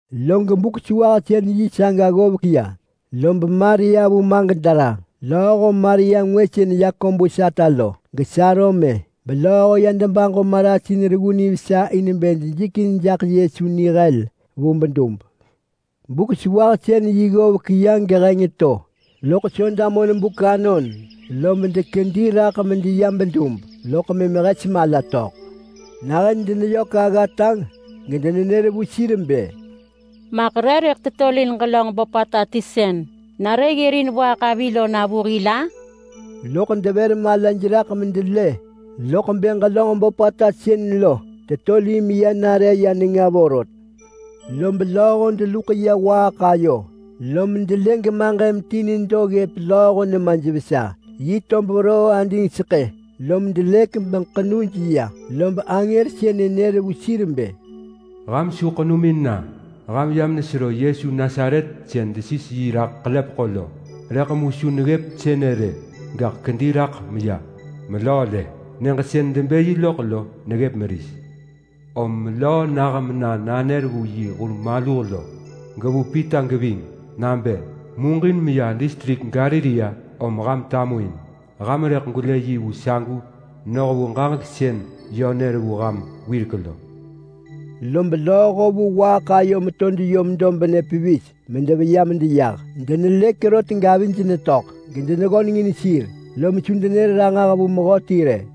Log Buk-sewahsën-yi saga ggovek ya, lob Maria vu Magdala lööho Maria ngwë sën Yakobus ata lo, geSalome, belööho ya debaġo marasin reggu nivesa in bë dejikin jaḳ Yesu nihel vu bedub. Buk-sewahsën-yi ggovek ya geheng to, loḳ Soda monbuk anon, lob dekedi raḳ medeya bedub, loḳ mëm hes mala töḳ. Nahën deneyök aggata gedenenër vu sir bë, “Maḳ re rëḳ tetolin ġelönġ böpata ti sën nare ggërin waaḳ avi lo na vu hil-a?” Loḳ devër malaj raḳ medelë loḳ bë ġelönġ böpata sën lo tetolin meya nare ya nenga vorot. Lob lööho deluḳ ya waaḳ ayo lom delë gemaġëm ti nedo ggëp lööho nemaj vesa. Yi tob veroo adingseḳë, lom delëk meḳenuj ya. Lob angër sënë nër vu sir bë, “Ham su ḳenumin na! Ham yam nesero Yesu Nasaret sën desis yi raḳ ḳelepeḳo lo. Rëḳ mu su neggëp sënë rë, gaḳ kedi raḳ meya. Melöö lë! Nyëġ sën debë yi loḳ lo neggëp meris. Om melöö nah mena nanër vu yi hur maluh, gevu Pita geving, nabë: Muġin meya distrik Galilea om ham tamuin. Ham rëḳ gwelë yi vu sagu noh vu ġaġek sën yö nër vu ham wirek lo.” Lob lööho vu waaḳ ayo meto deyom dobnë pevis medeveya medeyah. Denelëk rot gavij netöḳ gedeneggöneng in sir, lom su denër ranġah vu mehöti rë.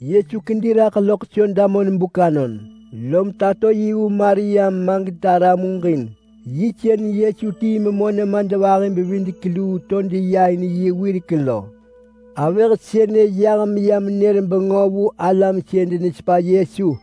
[Yesu kedi raḳ loḳ Soda monbuk anon, lom tato yi vu Maria vu Magdala muġin. Yi sën Yesu tii memö nemadvahi-bevidek-luu to deya in yi wirek lo. Avëh sënë yah meya menër bengö vu alam sën denesepa Yesu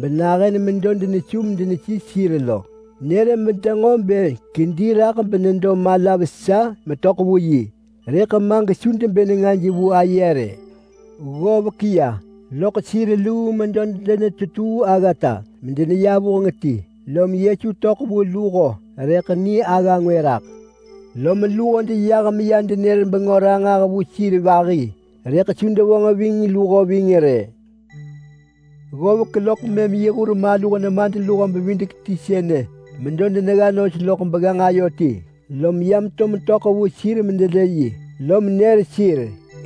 benahën medo denesu medenesis sir lo. Nër bedenġo bë kedi raḳ menedo mala vesa metöḳ vu yi, rëḳ ma gesu debë nengaj vu aye rë. Ggovek ya loḳ sir luu medo denetetuu aggata medeneya vuheng ti, lom Yesu töḳ vu luho rëḳ ni agga ngwë raḳ. Lom luho deyah meya denër bengö ranġah vu sir vahi, rëḳ su devonġ ving luho ving rë. Ggovek loḳ mëm yi hur maluh nemadluho-bevidek-ti sënë medo denegga nos loḳ begganġ ayo ti, lom ya meto metöḳ vu sir medelë yi, lom nër sir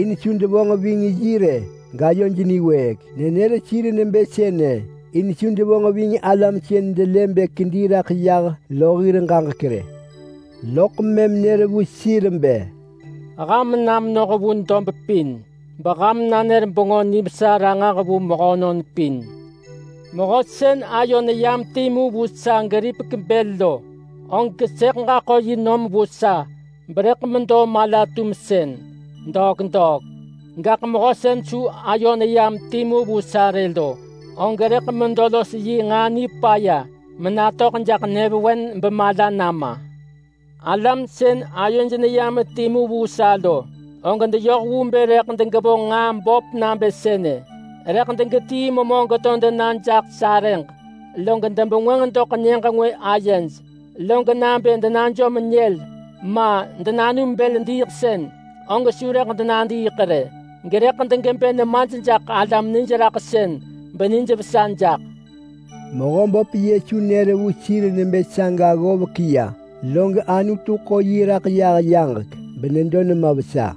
in su devonġ ving yi rë gayoj niwëëk. Nenër sir nebë sënë in su devonġ ving alam sën delë bë kedi raḳ yah lo hir ġaġek rë. Loḳ mëm nër vu sir bë, “Ham na menoh vu dob pin, beham nanër Bengö Nivesa ranġah vu mehönon pin. Mehö sën ayo neyam timu vu sa geripek bël lo, og sëḳ ġaḳo yi nom vu sa berëḳ medo mala-tumsën degwata. Gaḳ mehö sën su ayo neyam timu vu sa rë lo, og rëḳ medo los yi nġaa nipaya menatöḳ jaḳ nyëvewen bemala nama. Alam sën ayoj neyam timu vu sa lo, og deyoh vu bë rëḳ degevonġ nġaa böp nabë sënë: Rëḳ degetii memö geto dena jaḳ sarëġ, log debengwënġ doḳ nyëġ ngwë ayej, log nabë denajom nyël, ma, denanum bël diiḳsën, og su rëḳ denadiiḳ rë. Gerëḳ degebë nemaj jaḳ alam nijraḳsën benijvesa jaḳ.” Mehöböp Yesu nër vu sir nebë saga ggovek ya, log Anutu ḳo yi raḳ yah yaġek benedo nema vesa.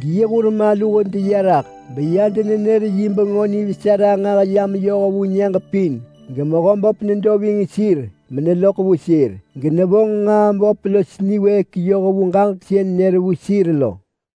Geyi hur maluh deya raḳ beya denenër yi Bengö Nivesa ranġah ya meyoh vu nyëġ pin, geMehöböp nedo ving sir meneloḳ vu sir, genevonġ nġaa böp los niwëëk yoh vu ġaġek sën nër vu sir lo.]